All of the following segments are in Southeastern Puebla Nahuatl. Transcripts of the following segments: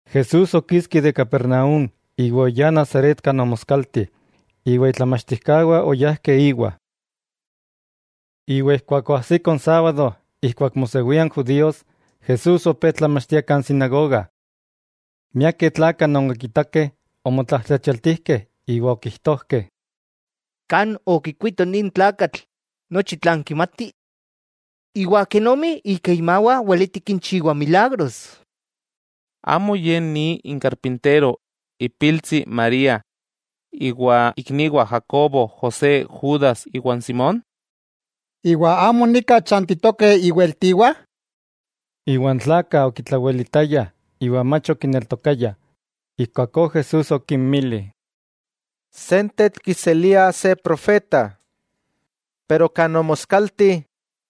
Jesús okiski de Capernaúm iwa oyá Nazaret kan omoskalti, iwa itlamachtijkawah oyajkeh íwa. Iwa ijkuak oajsiko n sábado ijkuak mosewia n judíos, Jesús opé tlamachtia kan sinagoga. Miakeh tlakah non okikakeh omotlajtlachialtijkeh iwa okijtojkeh: —¿Kan okikuito nin tlakatl nochi tlan kimati? ¿Iwa kenomi ika imawah weleti kinchiwa milagros? ¿Amo Ye ni n karpintero, ipiltsi n María, iwa ikniwah Jacobo, José, Judas iwa Simón? ¿Iwa amo nika chantitokeh iweltiwah? N tlakah okitlawelitayah iwa mach okineltokayah. Ijkuakó Jesús okinmili: —Sentetl kiseliah se profeta, pero kan omoskalti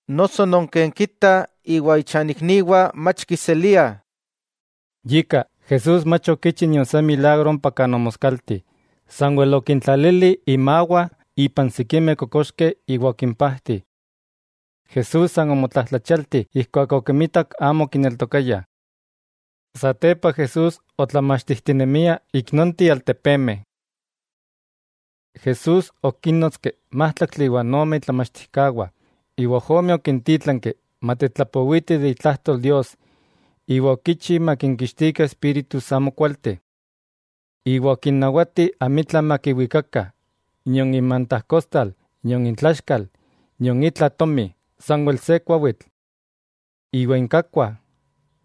noso non ken kita iwa ichanikniwah mach kiseliah. Yika, Jesús mach okichi nion se milagro ompa kan omoskalti. Sanwel okintlalili imawah ipan sikimeh kokoxkeh iwa okimpajti. Jesús san omotlajtlachialti ijkuak okimitak amo okineltokayah. Satepa Jesús otlamachtijtinemia ik nonteh altepemeh. Jesús okínnotski májtlaktli iwa ome itlamachtijkawah, iwa ojomeh okintítlanki matetlapowitih de itlajtol Dios iwa okichi makinkixtikah espíritus amokualteh. Iwa okinnawati amitla makiwikakah, nion inmantajkostal nion intlaxkal, nion itla tomi, sanwel se kuawitl. Iwa inkakkuah,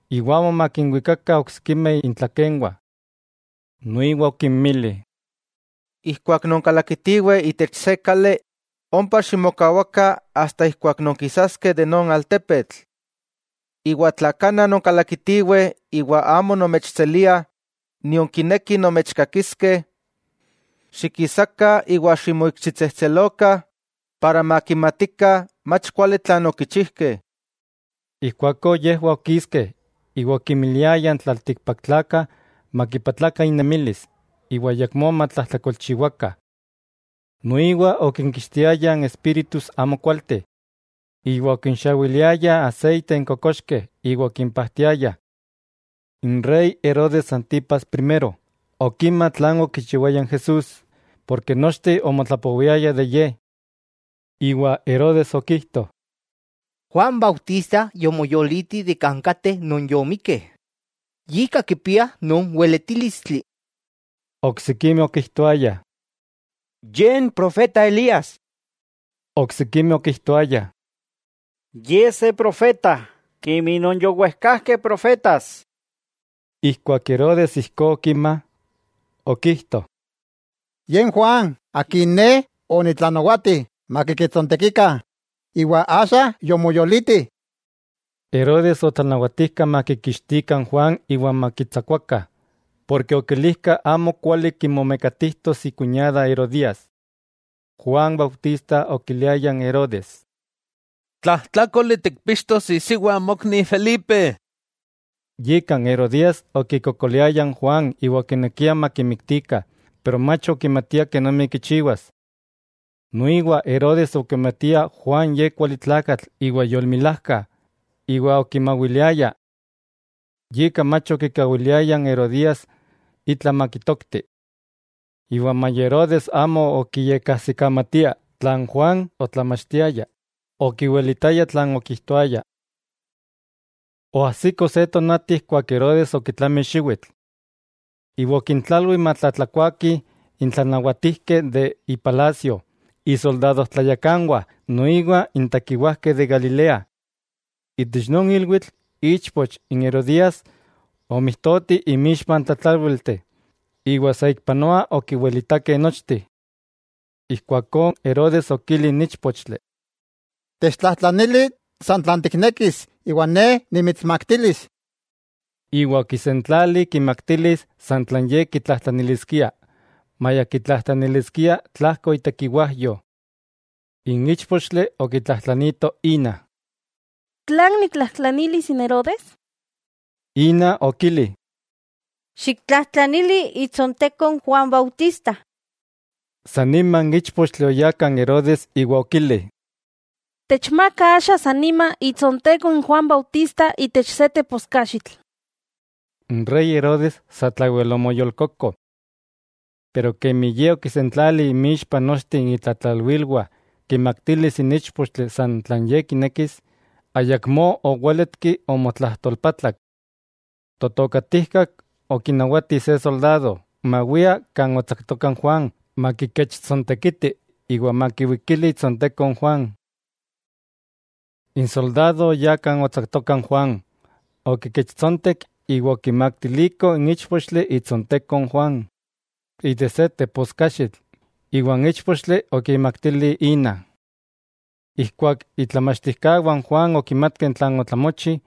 iwa amo makinwikakah oksikimeh intlakenwah. Noiwa okinmili: —Ijkuak nonkalakitiweh itech se kali, ompa ximokawakah asta ijkuak nonkikawaskeh non altepetl. Iwa tla kana nonkalakitiweh iwa amo nomechseliah nion kinekih nomechkakiskeh, xikisakah iwa ximoikxitsejtselokah, para makimatikah mach kuali tlan okichijkeh. Ijkuakó yejwah okiskeh iwa okinmiliayah n tlaltikpaktlakah, makipatlakah innemilis iwa ayakmó matlajtlakolchiwakah. Noiwa okinkixtiayah espíritus amokualteh, iwa okinxawiliayah aseite n kokoxkeh iwa okimpajtiayah. N rey Herodes Antipas Primero okima tlan okichiwaya n Jesús, ken nochteh omotlapowiayah de Ye. Iwa Herodes okijto: —Juan Bautista yomoyoliti de kan kateh non yomikkeh, yika kipia non weletílistli. Oksikimeh okijtoayah: —Ye n profeta Elías. Oksikimeh okijtoayah: —Ye se profeta kemi non yowejkajkeh profetas. Ijkuak Herodes ijkó okima, okijto: —Ye n Juan, akin ne onitlanawati makikechtsontekikah, iwa axa yomoyoliti. Herodes otlanawatijka makikitskikah n Juan iwa makitsakuakah, ken okilijka amokuali kimomekatijtos ikuñada Herodías. Juan Bautista okiliaya n Herodes: —Tlajtlákoli tikpixtos isiwa mokni Felipe. Yika n Herodías okikokoliaya n Juan iwa okinekia makimiktikah, pero mach okimatia kenomi kichiwas. Noiwa Herodes okimatia Juan ye kuali tlakatl iwa yolmilajka, iwa okimawiliaya. Yika mach okikawiliaya n Herodías itla makitokti. Maya Herodes amo okiyekajsikamatia tlan Juan otlamachtiaya, okiwelitaya tlan okijtoaya. Oajsiko se tonati ijkuak Herodes okitlami xiwitl. Iwa okintlalwi matlatlakuakih n tlanawatijkeh de ipalasio, isoldado tlayakanwah noiwa n tekiwajkeh de Galilea. Itech non ilwitl ichpoch n Herodías omijtoti inmixpa n tlatlálwilteh iwa saikpanoa okiwilitakeh nochteh. Ijkuakó Herodes okili n íchpochtli: —Techtlajtlanili san tlan tiknekis iwa ne nimitsmaktilis. Iwa okisentlali kimaktilis san tlan ye kitlajtlaniliskia, maya kitlajtlaniliskia tlajko itekiwajyo. N íchpochtli okitlajtlanito ína: —¿Tlan niktlajtlanilis n Herodes? Ína okili: —Xiktlajtlanili itsonteko n Juan Bautista. San nima n íchpochtli oyá kan Herodes iwa okili: —Techmaka axa san nima itsonteko n Juan Bautista itech se teposkaxitl. N rey Herodes satlawel omoyolkoko. Pero kemi ye okisentlali inmixpa nochteh itlatlalwilwah kimaktilis n íchpochtli san tlan ye kinekis, ayakmó owéletki omotlajtolpatlak. Totokatijkak okinawati se soldado, mawia kan otsaktoka Juan makikechtsontekiti iwa makiwalikili itsonteko n Juan. N soldado oyá kan otsaktoka n Juan, okikechtsontek iwa okimaktiliko n íchpochtli itsonteko n Juan itech se teposkaxitl, iwa n íchpochtli okimaktili ína. Ijkuak itlamachtijkawah n Juan okimatkeh tlan otlamochi,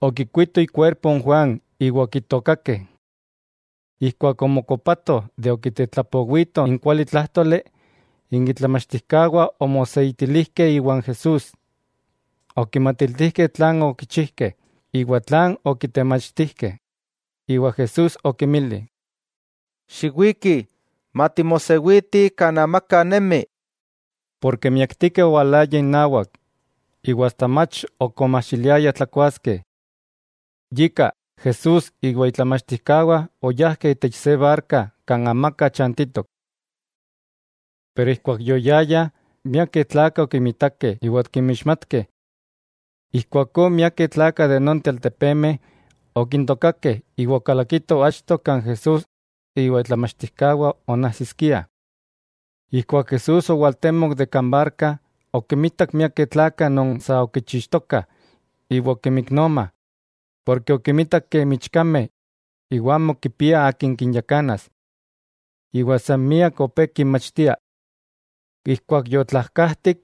okikuitoh ikuerpo n Juan iwa okitookakeh. Ijkuak omokopatoh de okitetlapowito n kualitlájtoli, n itlamachtijkawah omoseitilijkeh iwan Jesús. Okimatiltijkeh tlan okichijkeh, iwa tlan okitemachtijkeh. Iwa Jesús okinmili: —Xiwikih, matimosewitih kan amaka nemi. Ken miaktikeh owalayah inawak, iwa asta mach ok omajxiliayah tlakuaskeh. Yika, Jesús iwa itlamachtijkawah oyajkeh itech se barka kan amaka chantitok. Pero ijkuak yoyayah, miakeh tlakah okimitakeh iwa okimixmatkeh. Ijkuakó miakeh tlakah de nonteh altepemeh okintokakeh iwa okalakitoh achto kan Jesús iwa itlamachtijkawah onajsiskiah. Ijkuak Jesús owaltemok de kan barka, okimitak miakeh tlakah non sa okichixtokah iwa okimiknoma, ken okimitak kemi ichkameh non kipiah akin kinyakanas. Iwa san miak opé kinmachtia. Ijkuak yotlajkajtik,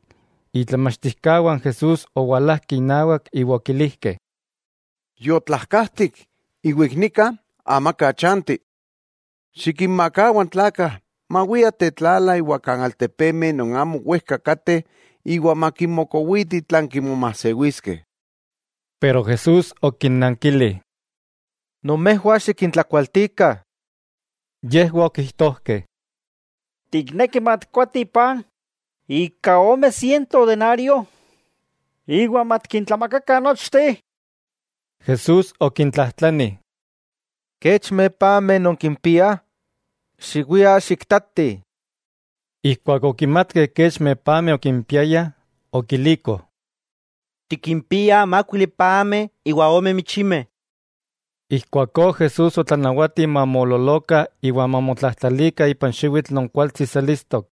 itlamachtijkawah n Jesús owalajkeh inawak iwa okilijkeh: —Yotlajkajtik, iwa ik nika amaka chanti. Xikinmakawa n tlakah mawiah tetlala iwa kan altepemeh non amo wejka kateh iwa makimokowitih tlan kimomajsewiskeh. Pero Jesús okinnankili: —Nomejwah xikintlakualtikah. Yejwah okijtojkeh: —¿Tikneki matikkoatih paj ika ome siento denario, iwa matikintlamakakah nochteh? Jesús okintlajtlani: —¿Kechmeh pameh nonkimpiah? Xiwiah xiktatih. Ijkuak okimatkeh kechmeh pameh okimpiayah, okilikoh: —Tikimpiah mákuili pameh iwa ome michimeh. Ijkuakó Jesús otlanawati mamoololokah iwa mamotlajtlalikah ipan xiwitl non kualtsi selistok.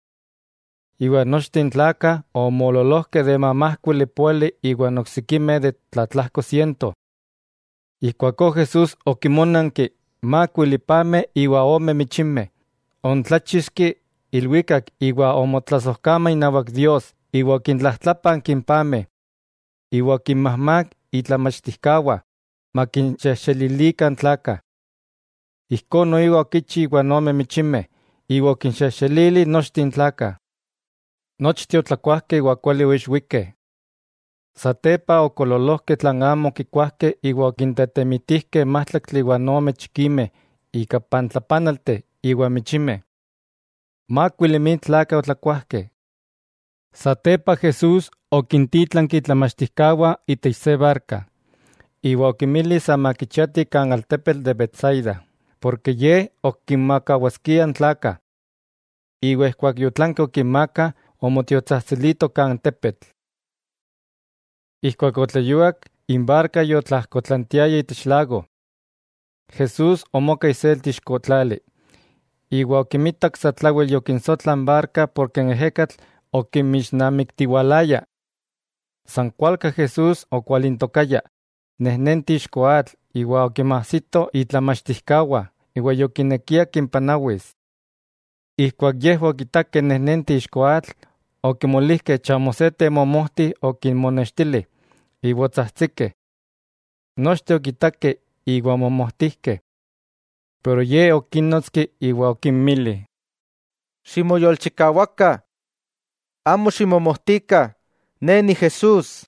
Iwa nochteh n tlakah omoololojkeh de mamajkuili póali iwa oksikimeh de tlatlajko siento. Ijkuakó Jesús okinmónanki n mákuili pameh iwa ome michimeh, oontláchixki ilwikak iwa omotlasojkama inawak Dios iwa okintlajtlápanki n pameh, iwa okinmajmák itlamachtijkawah makinxejxelilikah n tlakah. Ijkó noiwa okichi iwa ome michimeh, iwa okinxejxelili nochteh n tlakah. Nochteh otlakuajkeh iwa kuali oixwikeh. Satepa okoololojkeh tlan amo okikuajkeh iwa okintetemitijkeh májtlaktli iwa ome chikimeh ika pantlapanalteh iwa michimeh. Mákuili mil tlakah otlakuajkeh. Satepa Jesús okintítlanki itlamachtijkawah itech se barka, iwa okinmili sa makichiati kan altepetl de Betsaida, porke Ye ok kinmakawaskia n tlakah. Iwa ijkuak yotlanki okinmaaka, omotiotsajtsilito kan tepetl. Ijkuak otleyuak, n barka yotlajkotlantiaya itech lago. Jesús omoka iselti ixko tlali, iwa okimitak satlawel yokinsotla n barka porke n ejekatl okimixnamiktiwalaya. San kualka Jesús okwalintokaya nejnenti ixko atl iwa okinmajsito itlamachtijkawah iwa yokinekia kimpanawis. Ijkuak yejwah okitakeh nejnenti ixko atl, okimolijkeh chamo se temomojti okinmonextili iwa otsajtsikeh. Nochteh okitakeh iwa omomojtijkeh. Pero Ye okínnotski iwa okinmili: —¡Ximoyolchikawakah, amo ximomojtikah, Ne Ni Jesús!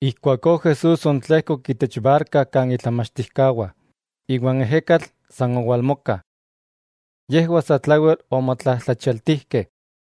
Ijkuakó Jesús oontlejkok itech barka kan itlamachtijkawah, iwa n ejekatl san owalmoka. Yejwah satlawel omotlajtlachialtijkeh,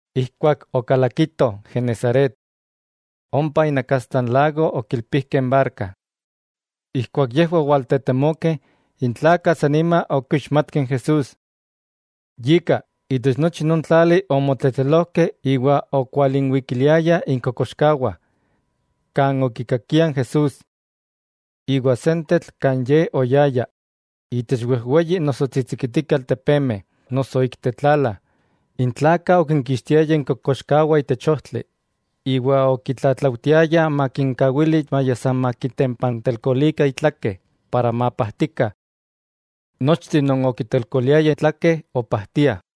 Ijkuak okalakitoh Genesaret, ompa inakastla n lago okilpijkeh n barka. Ijkuak yejwah owaltetemokeh, n tlakah san nima okixmatkeh n Jesús. Yika, itech nochi non tlali omotletlelojkeh iwa okwalinwikiliayah inkokoxkawah, kan okikakiah Jesús. Iwa sentetl kan Ye oyaya, itech wejweyi noso tsitsikitikeh altepemeh, noso ik tetlala, n tlakah okinkixtiayah inkokoxkawah itech ojtli, iwa okitlatlaujtiayah makinkawili maya san makitempantelkolikah itlake para mapajtikah. Nochteh non okitelkoliayah itlake opajtiah.